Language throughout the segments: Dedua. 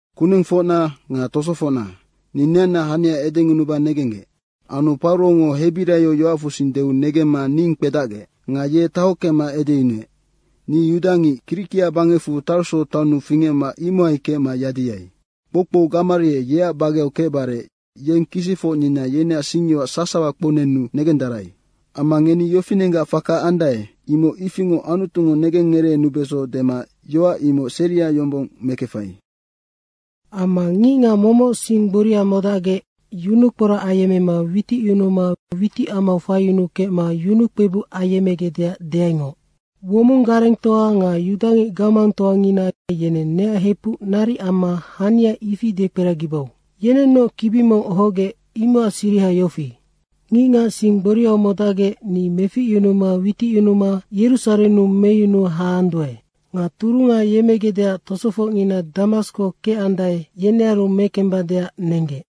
“Kunengfocna nga tosofocna, ni neanna hania edengunuba negenggec.” Anu Paurongo hebiraio yoacfusing deu negemma ning kpedacgec. Nga ye tahockema edeyunuec, “Ni yudangic, Kirikia bangecfu Tarso taonnu fingecma imohai kecma yadiai. Kpoukpou Gamarie yeac bageau kecbare yeng kisicfocnina yeneac singyoac sasawa kpounenu negendarai. Amma ngeni yofinenggac faka andae, imoc ifingoc Anutungo negengngereenubeso dema yoac imoc seria yombong mekefai. Amma ngicngac momoc sing gboria modacgec yunukporac ayemmema witicyunuma witicamau faiyunukecma yunukpebuc ayemmegecdeac deaingoc. Womong garengtoa nga yudangic gamangtoangina yeneng neac hepuc naric amma hania ifia dekperagibau. Yenennoc kibi mong ohogec, imocac siriha yofi: Ngicngac sing gboriau modacgec ni meficyunuma witicyunuma Yerusarennu meyunu haanduae. Nga turunga yemmegecdeac tosofocngina Damasko kecandae, yenearu mekembadeac nenggec.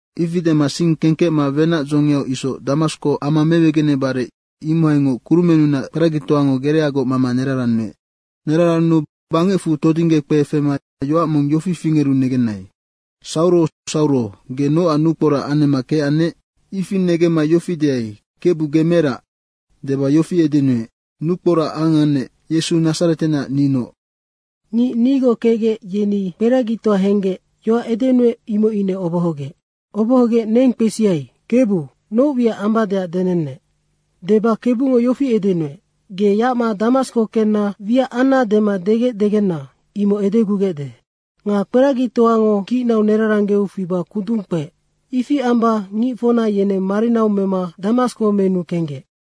Ifi dema sing kengkecma wenac dzongiau isoc Damasko ama mewegenebare, imohaingoc kurumennunac kperagitoango gereagoc mama nerarannuec. Nerarannuu bangecfu todingge kpe fema yoac mong yofi fingeru negenai, ‘Sauro Sauro, ge nocac nukporac anemma kecannec?’ Ifi negemma yofi deai, ‘Kebu ge merac?’ Deba yofi edenuec, ‘Nukporac angannec, Yesu Nadzaretenac ninoc.’ Ngic nigoc kecgec, yeni kperagitoa henggec, yoac edenuec imoc ine obohogec. Obohogec neng kpesiai, ‘Kebu, noc wiac ambadeac denennec.’ deba Kebungo yofi edenuec, ‘Ge yacma Damasko kenna wiac anna dema degecdegena, imoc edegugecde.’ Nga kperagitoango kicnau neraranggeu fiba kundung kpeec. Ifi amba ngicfocna yeneng marinau mema Damasko menu kenggec.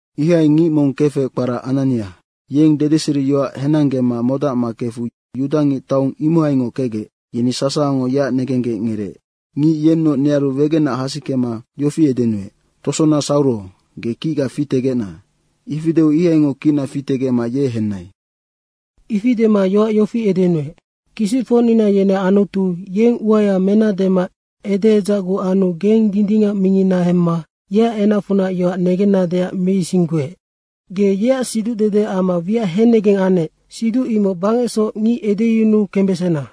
Ihai ngic mong kefec kpara Anania, yeng dedeseriyoac henanggema memodacma kefu yudangic taong imohaingoc kecgec, yeni sasawango yeac negenggec ngereec. Ngic yennoc nearu wegenac hasikema yofi edenuec, ‘Tosona Sauro, ge kicga fitegecna.’ ifi deu ihaingoc kicna fitegecma ye henai. Ifi dema yoac yofi edenuec, ‘Kisicfocnina yeneac Anutu, yeng uaya mena dema edeedzacgu anu geng Dindingac mingina hemma yeac enacfunac yoac negennadeac meisingguec. Ge yeac siducdede amma wiac hennegeng annec, siduc imoc bangecsoc ngic edeyunu kembesena.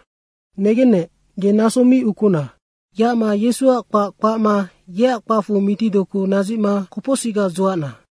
Negennec, ge naso mi ukuna! Yacma Yesuac kpac kpacna yeac kpacfu mitidoku nadzicma kopocsicga dzuacna.’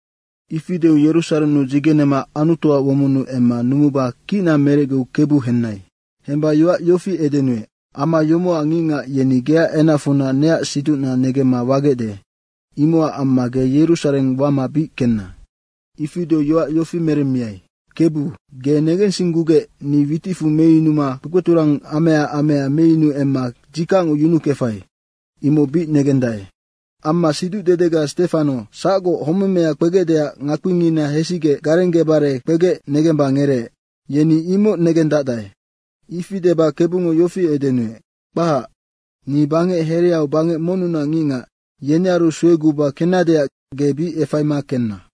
Ifi deu Yerusarennu dzigenema Anutuac womonnu emma numuba kicna merecgeu Kebu henai. Hemba yoac yofi edenuec, ‘Ama yomocac ngicngac yeni geac enacfunac neac siducna negemma wagecde, imocac amma ge Yerusareng wama bic kenna.’ Ifi deu yoac yofi meremmiai, ‘Kebu, ge negensinggugec, ni witicfu meyunuma kpekpeturangamea amea meyunu emma dzikacngo yunukefai, imoc bic negendae. Amma siducdedega Stefano sacgoc homemea kpegecdeac ngakpingina hesigec garenggebare kpegec negemba ngereec, yeni imoc negendacdae.’ Ifi deba Kebungo yofi edenuec, ‘Kpahac, ni bangec hereau bangec monnunac ngicngac, yenearu sueguba kennadeac ge bic efaima kenna.’”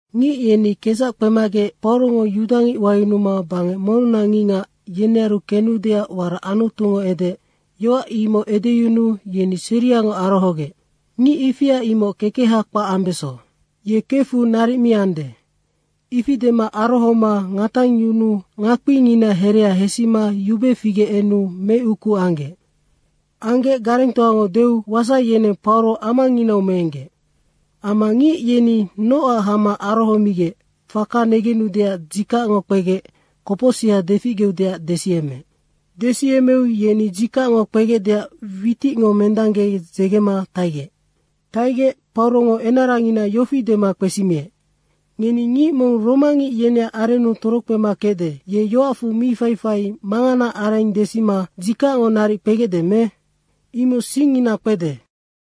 Ngic yeni kedzac kpemagec, Paurongo yudangic wayunuma bangec monnunac ngicngac, yenearu kenudeac warac Anutungo edeec, yoac imoc edeyunuu yeni seriangoc arohogec, “Ngic ifia imoc kekeha kpac ambeso. Ye kefu naric mi ande.” Ifi dema arohoma ngatangyunuu ngakpingina herea hesima yube figec enu meuku anggec. Anggec garengtoango deu wasai yeneng Pauro amanginau meenggec. Amma ngic yeni nocac homac arohomigec faka negenudeac dzikacngo kpegec kopocsiha deficgeudeac desiyemmeec. Desiyemmeu yeni dzikacngo kpegecdeac witicngo mendangge dzegema taigec. Taigec Paurongo enarangina yofi dema kpesimiec, “Ngeni ngic mong romangic yeneac arennu torokpema kecde, ye yoacfu mi faifai manganaac areng desima dzikacngo naric kpegecde me? Imoc singyoacngina kpede.”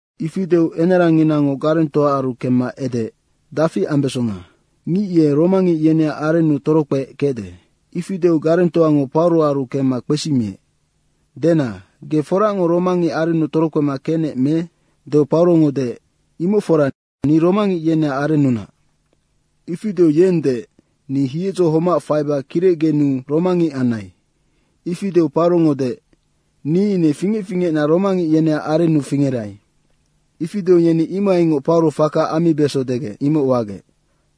Ifi deu enaranginango garengtoaaru kemma edeec, “Dafi ambesonga? Ngic ye romangic yeneac arennu torokpeec kecde.” Ifi deu garengtoango Pauroaru kemma kpesimiec, “Dena, ge foracngoc romangic arennu torokpema kecnec me?” deu Paurongo deec, “Imoc fora ni romangic yeneac arennunac.” Ifi deu yeng deec, “Ni hiedzo homac faiba kirecgenuu romangic anai.” Ifi deu Paurongo deec, “Ni ine fingec fingecna romangic yeneac arennu fingerai.” Ifi deu yeni imohaingoc Pauro faka ammibeso degec, imoc wagec.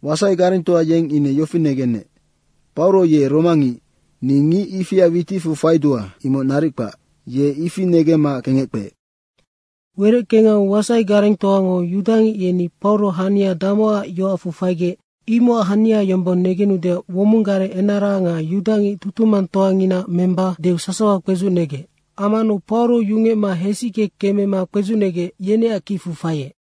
Wasai garengtoa yeng ine yofi negenec “Pauro ye romangic. Ni ngic ifia witicfu faidua, imoc naric kpac!” Ye ifi negemma kengec kpeec. Wereckengau wasai garengtoango yudangic yeni Pauro hania damocac yoacfu faigec, imocac hania yombong negenudeac womong gareng enara nga yudangic tutumangtoanginaac memba deu sasawa kpedzucnegec. Ammanu Pauro yungecma hesicke kemema kpedzucnegec, yeneac kicfu faiec.